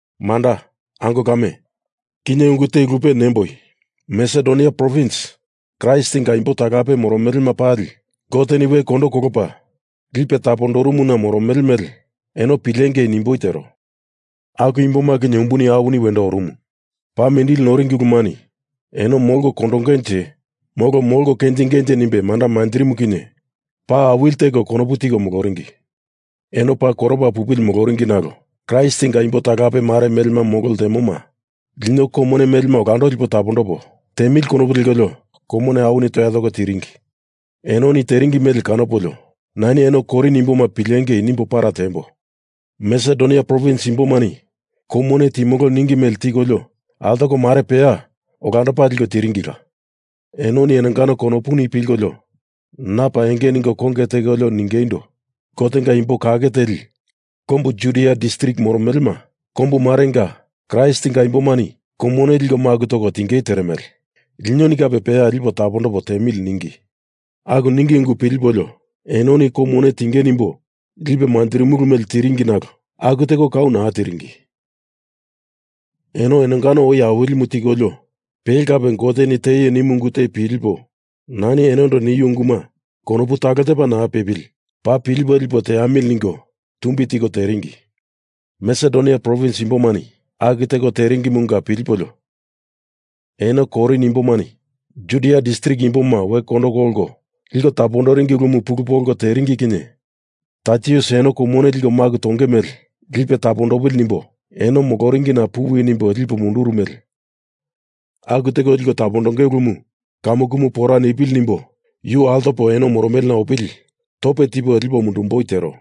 Manda, ango kame, kinye ungu te lupe nemboi, Masedonia provins Kraistinga imbo talape moromelema pali Goteni we kondo kolopa lipe tapondorumuna moromele mele eno pilengei nimboi tero. Aku imboma kinye umbuni awini wendo orumu, paa mindili noringi ulumani eno molko kondongenje molo molko kenjingenje nimbe manda manjirimu kinye paa awili teko konopu tiko moloringi. Eno paa koropa pupili moloringi nalo Kraistinga imbo talape mare melema molo ltemoma lino kou mone melema olando lipo tapondopo tiemili konopu lekolio kou mone awini toya toko tiringi. Enoni teringi mele kanopolio nani eno Korin imboma pilengei nimbo para tiembo. Masedonia provins imbomani kou mone timolo ningi mele tikolio, altoko mare peya olandopa liko tiringila. Enoni enongano konopuni pilkolio na paa enge ningo konge tekolio ningeindo, Gotenga imbo kake teli kombu Judia distrik moromelema kombu marenga Kraistinga imbomani kou mone liko maku toko tingei teremele linoni kape peya lipo tapondopo tiemili ningi. Aku ningi ungu pilipolio enoni kou mone tinge nimbo lipo manjirimulu mele tiringi nalo aku teko kau naa teringi. Eno enongano oi Awilimu tikolio, pele kape Goteni teaio nimu ungu te pilipo nani enondo niu unguma konopu talo tepa naa pepili paa pilipo lipo teamili ningo tumbi tiko teringi. Masedonia provins imbomani aku teko teringimunga pilipolio eno Korin imbomani Judia distrik imboma we kondo kolko liko tapondoringi ulumu pulu polko teringi kinye Taitusini eno kou mone liko maku tonge mele lipe tapondopili nimbo eno moloringina puwi nimbo lipo munduru mele aku teko liko tapondonge ulumu kamukumu pora nipili nimbo yu altopo eno moromelena opili tope tipo lipo mundumboi tero.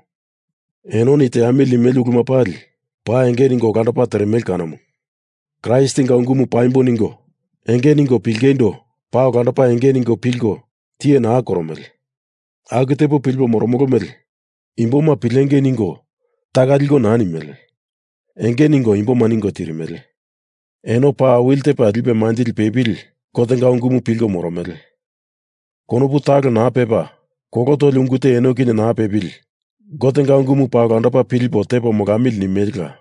Enoni teamili nimele uluma pali paa enge ningo olandopa teremele kanomu. Kraistinga ungumu paimbo ningo enge ningo pilingeindo paa olandopa enge ningo pilko tiye naa koromele. Aku tepo pilipo moromolo mele imboma pilengei ningo taka liko naa nimele. Enge ningo imboma ningo tirimele. Eno paa awili tepa lipe manjili pepili Gotenga ungumu pilko moromele. Konopu talo naa pepa kolo toli ungu te eno kinye naa pepili Gotenga ungumu paa olandopa pilipo tepo molamili nimelela.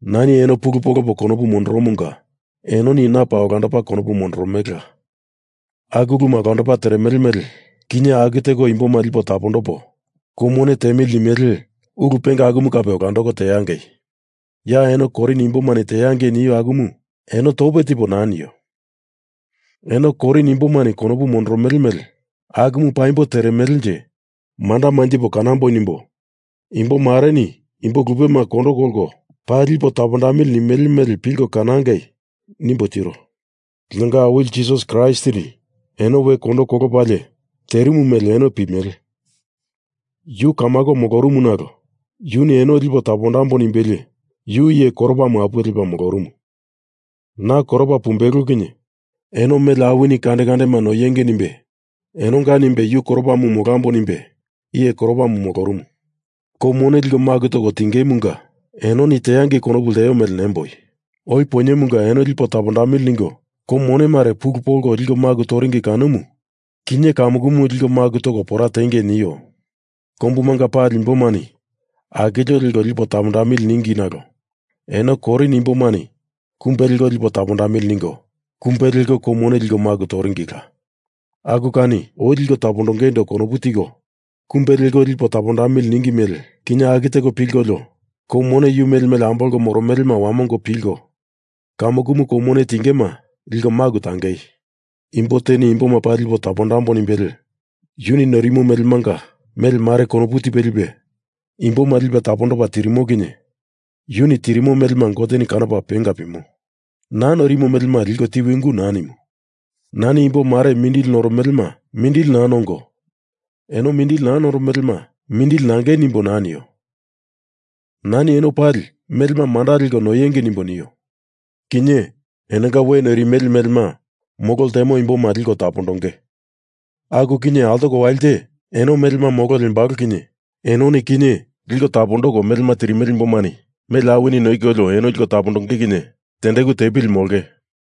Nani eno pulu polopo konopu mondorumunga enoni na paa olandopa konopu mondoromelela. Aku uluma olandopa teremele mele kinye aku teko imboma lipo tapondopo kou mone tiemili nimele ulu penga akumu kape olandoko teangei. Ya eno Korin imbomani teangei nio akumu eno tope tipo naa nio. Eno Korin imbomani konopu mondoromele mele akumu paimbo teremelenje manda manjipo kanamboi nimbo imbo mareni imbo lupema kondo kolko paa lipo tapondamili nimele mele pilko kanangei, nimbo tiro. Linonga Awili Jisas Kraistini eno we kondo kolopalie terimu mele eno pimele. Yu kamako molorumu nalo yuni eno lipo tapondambo nimbelie yu iye koropamu apuwe lepa molorumu. Na koropa pumbelo kinye eno mele awini kande kandema noinge nimbe enonga nimbe yu koropamu molambo nimbe iye koropamu molorumu. Kou mone liko maku toko tingemunga enoni teangei konopu lteo mele nemboi. Oi poinyemunga eno lipo tapondamili ningo kou mone mare pulu polko liko maku toringi kanomu, kinye kamukumu liko maku toko pora tiengei nio. Kombumanga pali imbomani akilio leko lipo tapondamili ningi nalo eno Korin imbomani kumbe leko lipo tapondamili ningo, kumbe leko kou mone liko maku toringila. Aku kani oi liko tapondongeindo konopu tiko kumbe leko lipo tapondamili ningi mele kinye, aku teko pilkolio kou mone yu mele mele ambolko moromelema wamongo pilko kamukumu kou mone tingema liko maku tangei. Imbo teni imboma paa lipo tapondambo nimbelie yuni noirimo melemanga mele mare konopu tipe lipe imboma lipe tapondopa tirimo kinye yuni tirimo melema Goteni kanopa penga pimo. Naa noirino melema liko tiwi ungu naa nimu. Nani imbo mare mindili noromelema mindili naa nongo, eno mindili naa noromelema mindili nangei nimbo naa nio. Nani eno pali melema manda leko noiengei nimbo nio. Kinye, enonga we noirimele melema molo ltemo imboma liko tapondonge. Aku kinye altoko walite eno melema molo lembalo kinye enoni kinye liko tapondoko melema tirimele imbomani mele awini noikolio eno liko tapondonge kinye tendeku tepili molonge.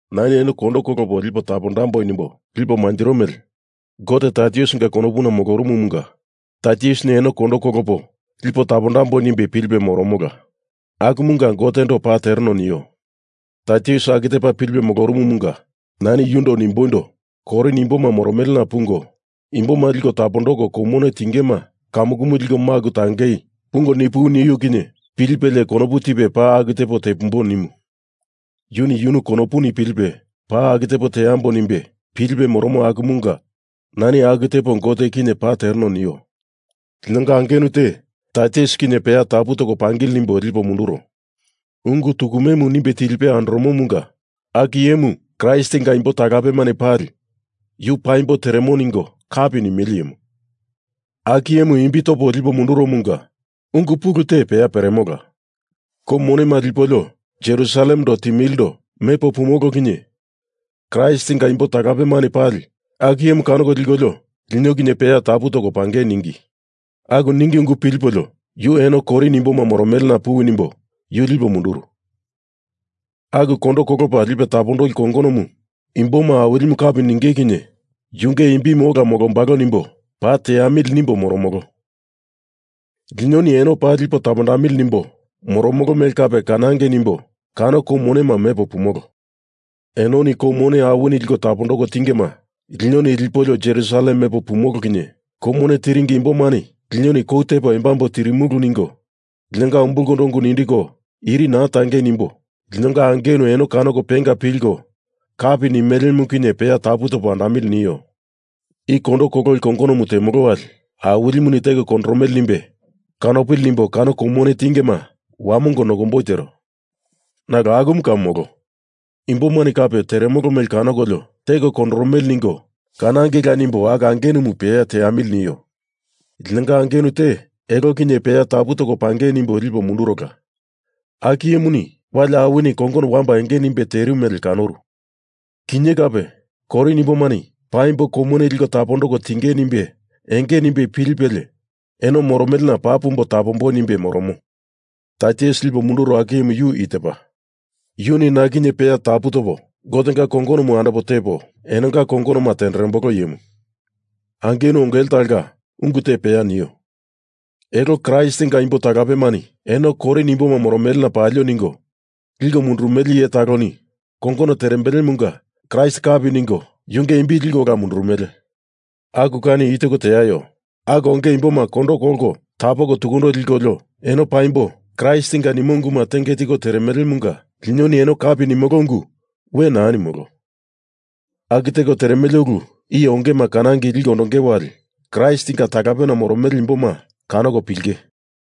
Nani eno kondo kolopo lipo tapondambo nimbo lipo manjiro mele Gote Taitusinga konopuna molorumumunga Taitusini eno kondo kolopo lipo tapondambo nimbe pilipe moromola, akumunga Gotendo paa tereno nio. Taitus aku tepa pilipe moromomunga nani yundo nimboindo Korin imboma moromelena pungo, imboma liko tapondoko kou mone tingema kamukumu liko maku tangei pungo nipuwi nio kinye pilipelie konopu tipe paa aku tepo tepumbo nimo. Yuni yunu konopuni pilipe paa aku tepo teambo nimbe pilipe moromo akumunga nani aku tepo Gote kinye paa tereno nio. Linonga angenu te Taitus kinye peya tapu toko pangili nimbo lipo munduro. Ungu tukumemu nimbe tilipe andoromomunga aku iyemu Kraistinga imbo talapemani pali yu paimbo teremo ningo kapi nimele iyemu. Aku iyemu imbi topo lipo munduromunga ungu pulu te peya peremola. Kou monema lipolio Jerusalemendo timilindo mepo pumolo kinye Kraistinga imbo talapemani pali aku iyemu kanoko likolio lino kinye peya tapu toko pangei ningi. Aku ningi ungu pilipolio yu eno Korin imboma moromelena puwi nimbo yu lipo munduro. Aku kondo kolopa lipe tapondoli kongonomu imboma Awilimu kapi ninge kinye yunge imbimu ola molombalo nimbo paa teamili nimbo moromolo. Linoni eno paa lipo tapondamili nimbo moromolo mele kape kanangei nimbo kano kou monema mepo pumolo. Enoni kou mone awini liko tapondoko tingema linoni lipolio Jerusalem mepo pumolo kinye kou mone tiringi imbomani Linoni kou tepo embambo tirimulu ningo linonga ungu umbulkondo nindiko iri naa tangei nimbo linonga angenu eno kanoko penga pilko kapi nimelemu kinye peya tapu topo andamili nio. I kondo kololi kongonomu temolo wali Awilimuni teko kondoromele nimbe kanopili nimbo kano kou mone tingema wamongo nokomboi tero. Nalo akumu kau molo. Imbomani kape teremolo mele kanokolio teko kondoromele ningo kanangeila nimbo aku angenumu peya teamili nio. Linonga angenu te elo kinye peya tapu toko pangei nimbo lipo mundurola. Aku iyemuni wali awini kongono wamba enge nimbe terimu mele kanoru. Kinye kape Korin imbomani paimbo kou mone liko tapondoko tinge nimbe enge nimbe pilipelie eno moromelena paa pumbo tapomboi nimbe moromo. Taitus lipo munduro aku iyemu yu i tepa. Yuni na kinye peya tapu topo Gotenga kongonomu andopo tepo enonga kongonoma tenderembolo iyemu. Angenu ongele talonga ungu te peya nio, Elo Kraistinga imbo talapemani eno Korin imboma moromelena palio ningo liko mundurumele iye taloni kongono terembelemunga Kraist kapi ningo yunge imbi liko ola mundurumele. Aku kani i teko teaio. Aku onge imboma kondo kolko tapoko tukundo likolio eno paimbo Kraistinga nimo unguma tenge tiko teremelemunga linoni eno kapi nimolo ungu we naa nimolo. Aku teko teremele ulu iye ongema kanangei liko ondonge wali Kraistinga talapena moromele imboma kanoko pilinge.